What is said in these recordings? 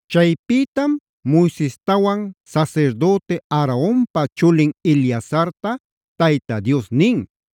Chaypïtam Moisestawan sasirdüti Aaronpa chulin Eleazarta Tayta Dios nin: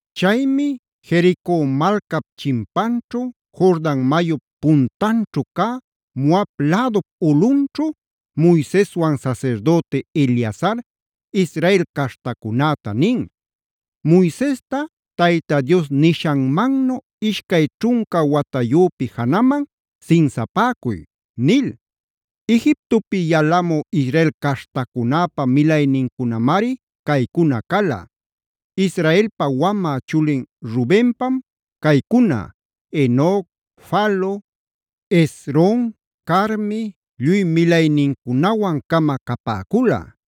Chaymi Jerico malcap chimpanćhu, Jordan mayup patanćhu cä Moab lädup ulꞌunćhu Moiseswan sasirdüti Eleazar Israel caśhtacunäta nin: “Moisesta Tayta Dios nishanmannu ishcay ćhunca watayüpi janaman sinsapäcuy” nil. Egiptopi yalamü Israel caśhtacunäpa milaynincunamari caycuna cala: Israelpa wamä chulin Rubenpam caycuna: Enoc, Falu, Hezron, Carmi, lluy milaynincunawan-cama capäcula.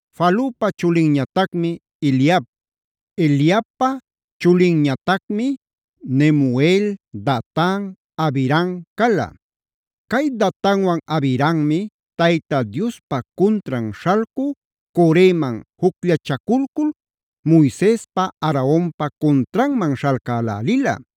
Falupa chulinñatacmi Eliab. Eliabpa chulinñatacmi: Nemuel, Datan, Abiram cala. Cay Datanwan Abirammi Tayta Diospa cuntran śhalcü Coreman jucllachaculcul Moisespa, Aaronpa cuntranman śhalcälälila.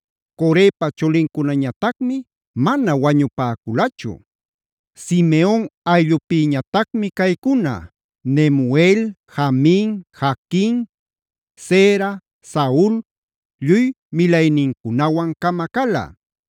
Corepa chulincunañatacmi mana wañupäculachu. Simeon ayllupïñatacmi caycuna: Nemuel, Jamin, Jaquin, Zerah, Saul, lluy milaynincunawan-cama cala.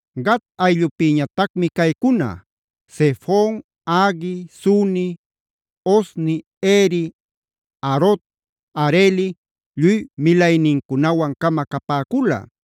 Gad ayllupïñatacmi caycuna: Zefon, Hagui, Suni, Ozni, Eri, Arod, Areli, lluy milaynincunawan-cama capäcula.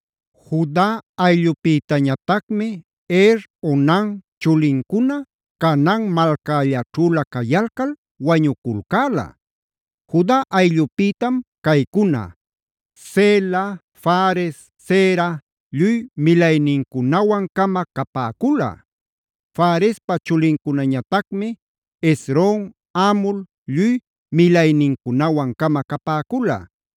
Juda ayllupïtañatacmi Er, Onan chulincuna Canaan malcällaćhüla cayalcal wañuculcäla. Juda ayllupïtam caycuna: Sela, Fares, Zera, lluy milaynincunawan-cama capäcula. Farespa chulincunañatacmi: Hezron, Hamul, lluy milaynincunawan-cama capäcula.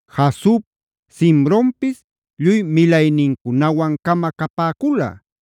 Jasub, Simronpis lluy milaynincunawan-cama capäcula.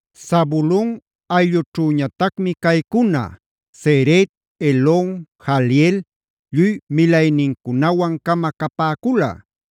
Zabulon ayllućhüñatacmi caycuna: Sered, Elon, Jahleel, lluy milaynincunawan-cama capäcula.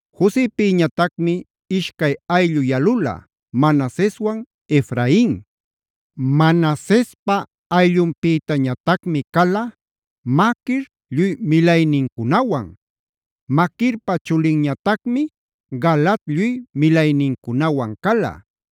Josepïñatacmi ishcay ayllu yalula: Manaseswan Efrain. Manasespa ayllupïtañatacmi cala: Maquir lluy milaynincunawan. Maquirpa chulinñatacmi: Galaad lluy milaynincunawan cala.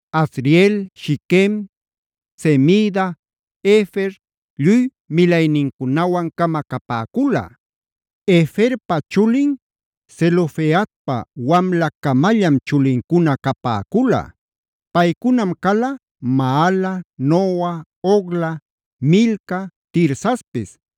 Asriel, Shiquem, Semida, Hefer, lluy milaynincunawan-cama capäcula. Heferpa chulin Zelofehadpa wamlacamallam chulincuna capäcula. Paycunam cala: Maala, Noa, Hogla, Milca, Tirsapis.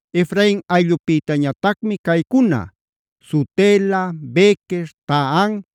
Efrain ayllupïtañatacmi caycuna: Sutela, Bequer, Tahan,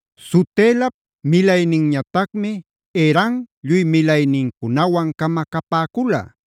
Sutelap milayninñatacmi: Eran lluy milaynincunawan-cama capäcula.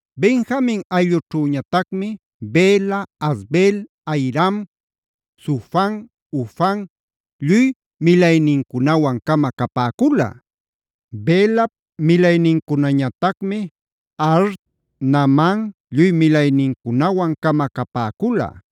Benjamin ayllućhüñatacmi: Bela, Asbel, Ahiram, Sufam, Hufam, lluy milaynincunawan-cama capäcula. Belap milaynincunañatacmi: Ard, Naaman lluy milaynincunawan-cama capäcula.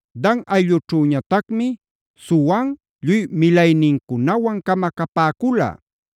Dan ayllućhüñatacmi: Suham lluy milaynincunawan-cama capäcula.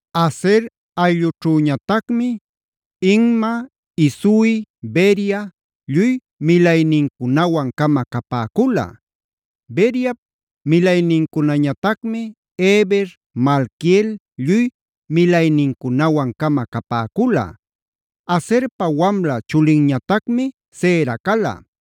Aser ayllućhüñatacmi: Imna, Isui, Beria, lluy milaynincunawan-cama capäcula. Beriap milaynincunañatacmi: Heber, Malquiel, lluy milaynincunawan-cama capäcula. Aserpa wamla chulinñatacmi Sera cala.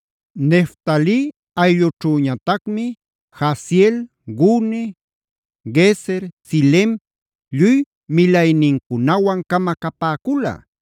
Neftali ayllućhüñatacmi: Jahzeel, Guni, Jezer, Silem, lluy milaynincunawan-cama capäcula.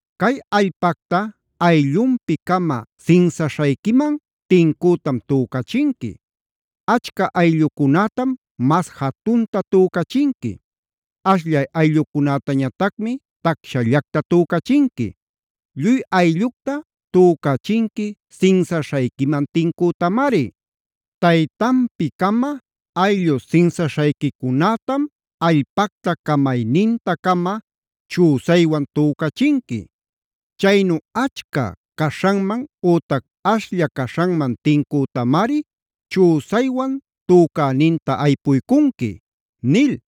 “Cay allpacta ayllunpi-cama sinsaśhayquiman tincütam tücachinqui. Achca ayllucunätam mas jatunta tücachinqui. Ashllay ayllucunätañatacmi tacshallacta tücachinqui. Lluy ayllucta tücachinqui sinsaśhayquiman tincütamari. Taytanpi-cama ayllu sinsaśhayquicunätam allpacta camayninta-cama chüsaywan tücachinqui. Chaynu achca caśhanman ütac ashlla caśhanman tincütam chüsaywan tücäninta aypuycunqui”b nil.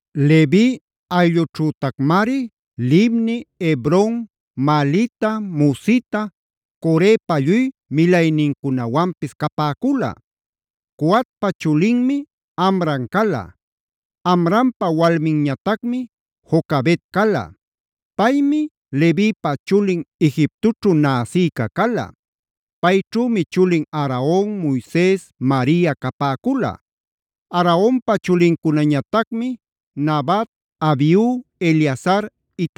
Levi ayllućhütacmari: Libni, Hebron, Mahlita, Musita, Corepa lluy milaynincunawanpis capäcula. Coatpa chulinmi Amram cala. Amrampa walminñatacmi Jocabed cala. Paymi Levipa chulin Egiptoćhu näsïca cala. Payćhümi chulin: Aaron, Moises, Maria capäcula. Aaronpa chulincunañatacmi: Nadab, Abiu, Eleazar,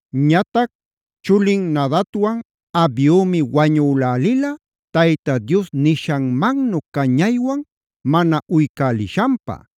Ñatac chulin Nadabwan Abiumi wañülälila Tayta Dios nishanmannu cañaywan mana uycälishanpä.d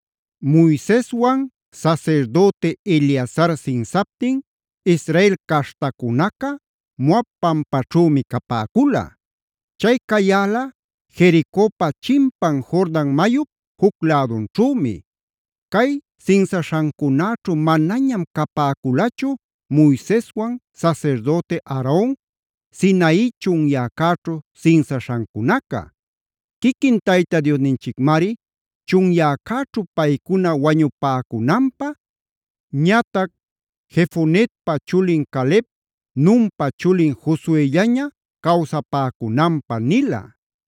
Moiseswan sasirdüti Eleazar sinsaptin Israel caśhtacunaca Moab pampaćhümi capäcula. Chay cayäla Jericopa chimpan Jordan mayup juc lädunćhümi. Cay sinsaśhancunäćhu manañam capäculachu Moiseswan sasirdüti Aaron Sinai chunyäcäćhu sinsaśhancunaca. Quiquin Tayta Diosninchicmari chunyäcäćhu paycuna wañupäcunanpä,e ñatac Jefonep chulin Caleb, Nunpa chulin Josuellaña cawsapäcunanpä nila.